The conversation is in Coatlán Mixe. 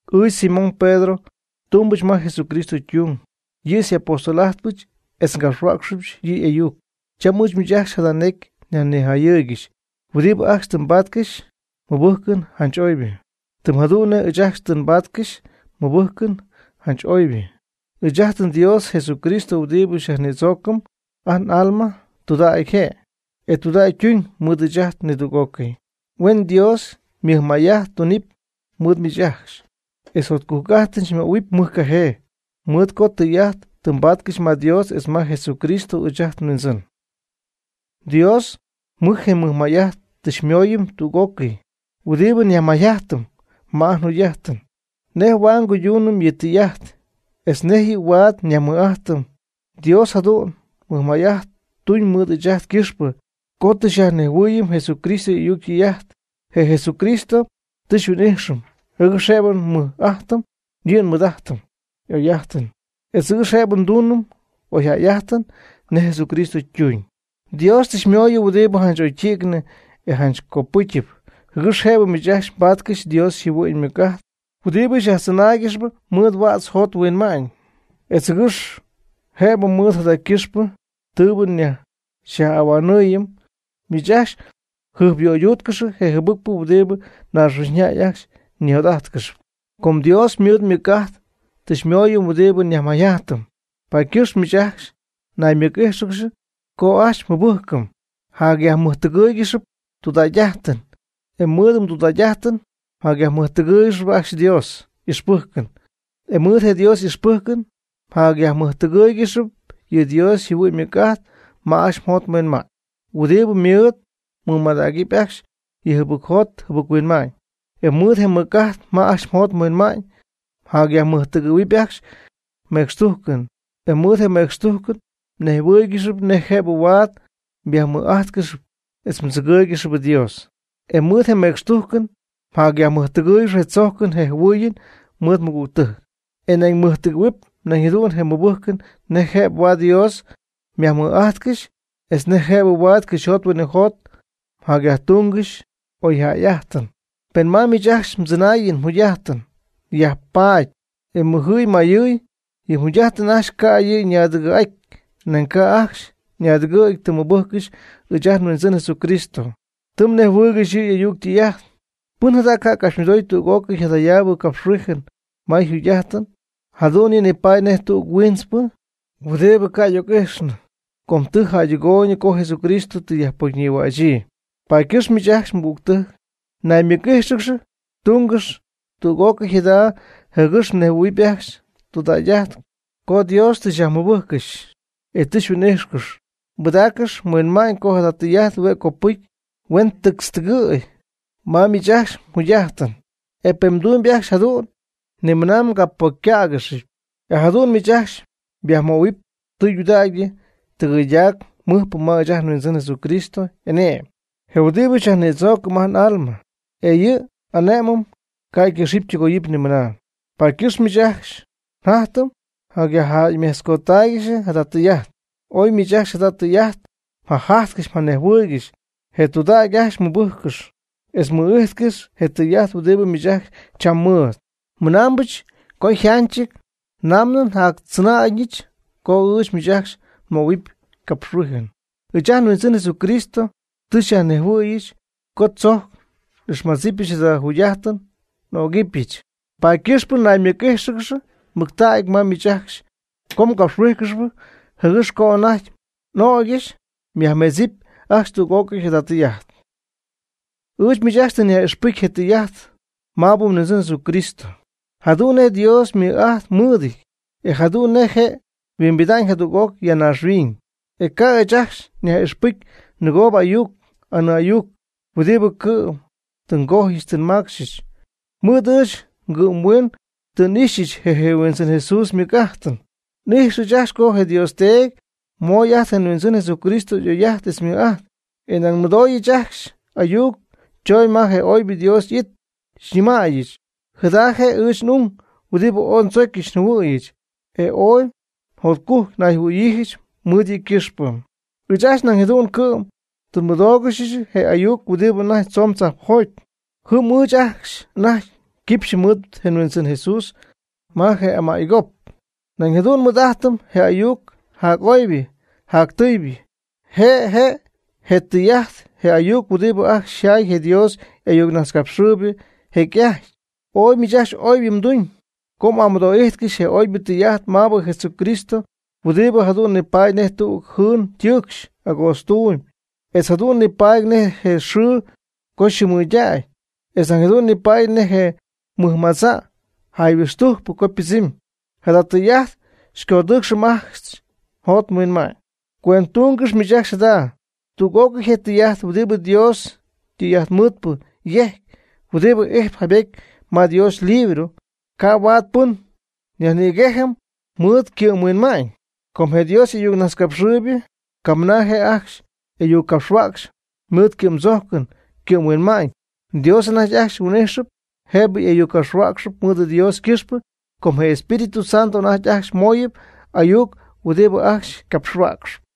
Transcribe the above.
Ɨɨch Simón Pedro, tumbɨch ma Jesucristo ytung. Yɨ' xy'apóstol'ajtpɨch etz ngapxhuäcxpyɨch yɨ' y'ayuc. Cham ɨɨch miich ajcxy jada necy nyajnijayɨɨygɨxy huɨdibɨ ajcxy tɨ mbaatcɨxy mɨbɨjcɨn janch oybɨ, tɨm jadu'n nej ɨɨch ajcxy tɨ nbáatcɨxyɨch mɨbɨjcɨn janch oybɨ. Ɨɨch ajt nDios je Jesucristo huɨdibɨ xyajnïdzoocɨm ajt n'alma tudägy je', e tudägy ytuñ mɨɨd ɨɨch ajt nidüg'ócɨy. Huen Dios mɨjmay'ajt tunɨpy mɨɨd miich ajcxy, etz jotcujc'ajtɨn xymöhuɨpy mɨjcajee, mɨɨd co tɨy'ajt tɨ mbaatcɨxy ma Dios etz ma je Jesús ɨɨch ajt nHuindzɨn. Dios mɨɨd je' ymɨj'ajt tɨ xymooyɨm tüg'ócɨy huɨdibɨ nyajmayjajtɨm ma ajt njugy'ajtɨn, nej huaad nguyduunɨm yɨ' ytɨy'ajt etz nej yɨ' huaad nyajmɨj'ajtɨm. Dios jadu'n mɨjmay'ajt tuun mɨɨd ɨɨch ajt ycɨxpɨ co tɨ xyajnejhuɨɨyɨm Jesucristo y'ayuc ytɨy'ajt. Je Jesucristo tɨ xyhuin'ijxɨm jɨgɨx jëbɨ nmɨɨd'ajtɨm yɨ' ymɨj'ajtɨn y'oy'ajtɨn, etz jɨgɨx jëbɨ nduunɨm oyjäy'ajtɨn nej Jesucristo tuuñ. Dios tɨ xymooyɨm huɨdibɨ janch oydi'cnɨ e janch copɨcyɨp jɨgɨx jëbɨ miich ajcxy mbaatcɨxy Dios yjɨhuɨ'ñ ymɨc'ajt huɨdibɨ xyajtzɨnaaygɨxy mɨɨd huädz jot huinma'ñ, etz jɨgɨx jëbɨ mɨɨd jada ycɨxpɨ tɨɨbɨ xyaj'ahuanɨɨyɨm, miich ajcxy mjɨjpyöyduutcɨxy je jɨbɨcpɨ huɨdibɨ naaxhuiñyjäy ajcxy ñijot'ajtcɨxyp. Com Dios mɨɨd ymɨc'ajt tɨ xymooyɨm huɨdibɨ nyajmayjajtɨm, paady ycɨxp miich ajcxy naymɨc'íjxɨgɨxy co ajcxy mmɨbɨjcɨn mjacyajmɨjtɨgɨ́ɨygɨxɨpy tudägy'ajtɨn; e mɨɨd mdudägy'ajtɨn mjacyajmɨjtɨgɨ́ɨygɨxɨpy ajcxy Dios y'ixpɨjcɨn; e mɨɨd je Dios y'ixpɨjcɨn mjacyajmɨjtɨgɨ́ɨygɨxɨpy yɨ Dios yjɨhuɨ'ñ ymɨc'ajt ma ajcxy mjot mhuinma'ñ huɨdibɨ mɨɨd mmɨmadägɨpy ajcxy yɨ jɨbɨcjot jɨbɨc-huinma'ñ; e mɨɨd je mɨc'ajt ma ajcxy mjot mhuinma'ñ jacyajmɨjtɨgɨ̈huɨpy ajcxy mecxtujcɨn; e mɨɨd je mecxtujcɨn mnejhuɨ́ɨygɨxɨpy nej jëb huaad myajmɨj'ajtcɨxy etz mdzɨgɨɨygɨxy Dios; e mɨɨd je mecxtujcɨn mjacyajmɨjtɨgɨ́ɨygɨxɨpy je tzojcɨn je jɨhuɨɨyɨn mɨɨd mɨgügtɨjc; e nañ mɨjtɨgɨ̈huɨpy nañ jadu'n je mɨbɨjcɨn nej jëb huaad Dios myajmɨj'ajtcɨxy etz nej jëb huaad cɨxyjot huinɨjot mjacyajtungɨxy oyjäy'ajtɨn. Pen ma miich ajcxy mdzɨnaayɨn mjugy'ajtɨn yajpattäy e ymɨjɨ̈y ymayɨ̈y, yɨ mjugy'ajt ajcxy ca' yɨ' ñaadɨgɨ̈'aty; nañ ca' anajty ajcxy naadɨgɨ' tɨ mmɨbɨjccɨxy ɨɨch ajt nHuindzɨn Jesucristo, tɨ mnejhuɨɨygɨxy yɨ' y'ayuc ytɨy'ajt. Pɨn jada ca' capxymɨdooy tüg'ócɨy jadayaabɨ capxhuijɨn ma yjugy'ajtɨn, jadu'n yɨ' nipaady nej tüg huiintzpɨ o huɨdibɨ y'ijxɨn con, tɨ jäydɨgoy co Jesucristo tɨ yajpocyñïhuaatzp. Paady ycɨxp miich ajcxy mɨgügtɨjc, naymɨc'íjxɨgɨxy tungɨx tüg'ócɨy jada jɨgɨx mnejhuɨ̈huɨpy ajcxy tɨydudägy co Dios tɨ xyajmɨbɨjccɨxy e tɨ xyhuin'ijxcɨxy. Pɨdaaccɨx mhuinma'ñ co jada tɨy'ajt huen copɨcy, huen tictztɨgɨ̈y ma miich ajcxy mjugy'ajtɨn. E pen mdumyb ajcxy jadu'n, nimɨna mgapocycägɨxɨpy. E jadu'n miich ajcxy myajmöhuɨpy tɨydudägy tɨgɨydac mɨjpɨ ma ɨɨch ajt nHuindzɨn Jesucristo y'ane'my, je huɨdibɨ xyajnïdzoocɨm ajt n'alma. E yɨ' y'ane'mɨn ca' ycɨxɨpy ytɨgoyɨpy nimɨna. Paady ycɨxp ɨɨch miich ajcxy jatyɨmy yajjäymejtzcoodaangɨxy jada tɨy'ajt. Oy miich ajcxy jada tɨy'ajt mjajajtcɨxy mjanejhuɨɨygɨxy, e tudägy ajcxy mmɨbɨjccɨxy etz mmɨ'ijtcɨxy je tɨy'ajt huɨdibɨ miich ajcxy cham mɨɨd. Mɨnaambɨch co yjanchɨty namɨ njactzɨnaayñɨch co ɨɨch miich ajcxy nmöhuɨpy capxhuijɨn. Ɨɨch ajt nHuindzɨn Jesucristo tɨ xyajnejhuɨ̈yɨch co tzojc n'ixmadzɨpyɨch jada njugy'ajtɨn (n'ögɨbɨch). Paady ycɨxp naymɨc'ixyiijɨch mɨctägy ma miich ajcxy co ngapxhuijcɨxy jɨgɨx co anajty n'ögyɨch mjäymetzɨɨyb ajcxy tüg'ócɨy jada tɨy'ajt. Ɨɨch miich ajcxy tɨ nyaj'ixpɨcy je tɨy'ajt maabɨ nHuindzɨn Jesucristo, jadu'n nej Dios ymɨj'ajt mɨɨdɨty, e jadu'n nej je' yhuimbida'ñ jadüg'oc ya naaxhuiñ. E ca' ɨɨch ajcxy nyaj'ixpɨcy nɨgoo'ayuc anɨɨ'ayuc huɨdibɨ cɨ'm tɨ ngojyɨch tɨ nmacxyɨch. Mɨɨd ɨɨch ngɨ'mhuiin tɨ n'íjxcɨxyɨch je Huindzɨn Jesús ymɨj'ajtɨn. N'ijx ɨɨch ajcxy co je Dios Teedy mooy ajt nHuindzɨn Jesucristo oy'ajt etz mɨj'ajt. E nañ nmɨdooyɨch ajcxy ayuc choñ ma je oybɨ Dios y'it, xyñɨmaayɨ: “Jada je' ɨɨch n'ung huɨdibɨ ooy ndzocyɨch njɨhuɨ̈yɨch, e ooy jotcujc nayjɨhuɨ̈yiijɨch mɨɨd yɨ' ycɨxpɨ.” Ɨɨch ajcxy nañ jadu'n cɨ'm tɨ nmɨdóogɨxyɨch je ayuc huɨdibɨ anajty tzomb tzajpjoty. Jɨm ɨɨch ajcxy anajty quipxyɨ mɨɨd je Huindzɨn Jesús ma je amay gop. Nañ jadu'n nmɨɨd'ajtɨm je ayuc jac'oybɨ jactɨɨybɨ. Je' je' je tɨy'ajt je ayuc huɨdibɨ ajcxy yjay je Dios y'ayucnajtzcapxɨɨybɨ jecy'ajty. Oy miich ajcxy oybɨ mduñ co m'amɨdoo'ijtcɨxy je oybɨ tɨy'ajt maabɨ Jesucristo huɨdibɨ jadu'n nipaady nej tüg jɨɨn tɨɨcxp agootztuum etz jadu'n nipaady nej je xɨɨ co yxɨɨmɨydäy, etz jadu'n nipaady nej je mɨjmadza' jayhuɨxtujcpɨ co ypɨdzɨmy. Jada tɨy'ajt xycodɨɨcxɨp ajcxy mjot mhuinma'ñ. Cuendtungɨx miich ajcxy jada: tüg'ócɨy je tɨy'ajt, huɨdibɨ Dios ytɨy'ajtmɨɨdpɨ yejc huɨdibɨ ijtp jaybety ma Dios ylibro, ca' huaad pɨn yajnïgejɨp mɨɨd ycɨ'mhuinma'ñ. Com je Dios y'ayucnajtzcapxɨɨybɨ camɨna je' ajcxy ayuccapxhuäcxy mɨɨd ycɨ'mdzojcɨn ycɨ'mhuinma'ñ. Dios anajty ajcxy huin'íxyɨp jëbɨ ayuccapxhuäcxy mɨɨd Dios ycɨxpɨ com je Espíritu Santo anajty ajcxy mooyɨp ayuc huɨdibɨ ajcxy ycapxhuäcxyp.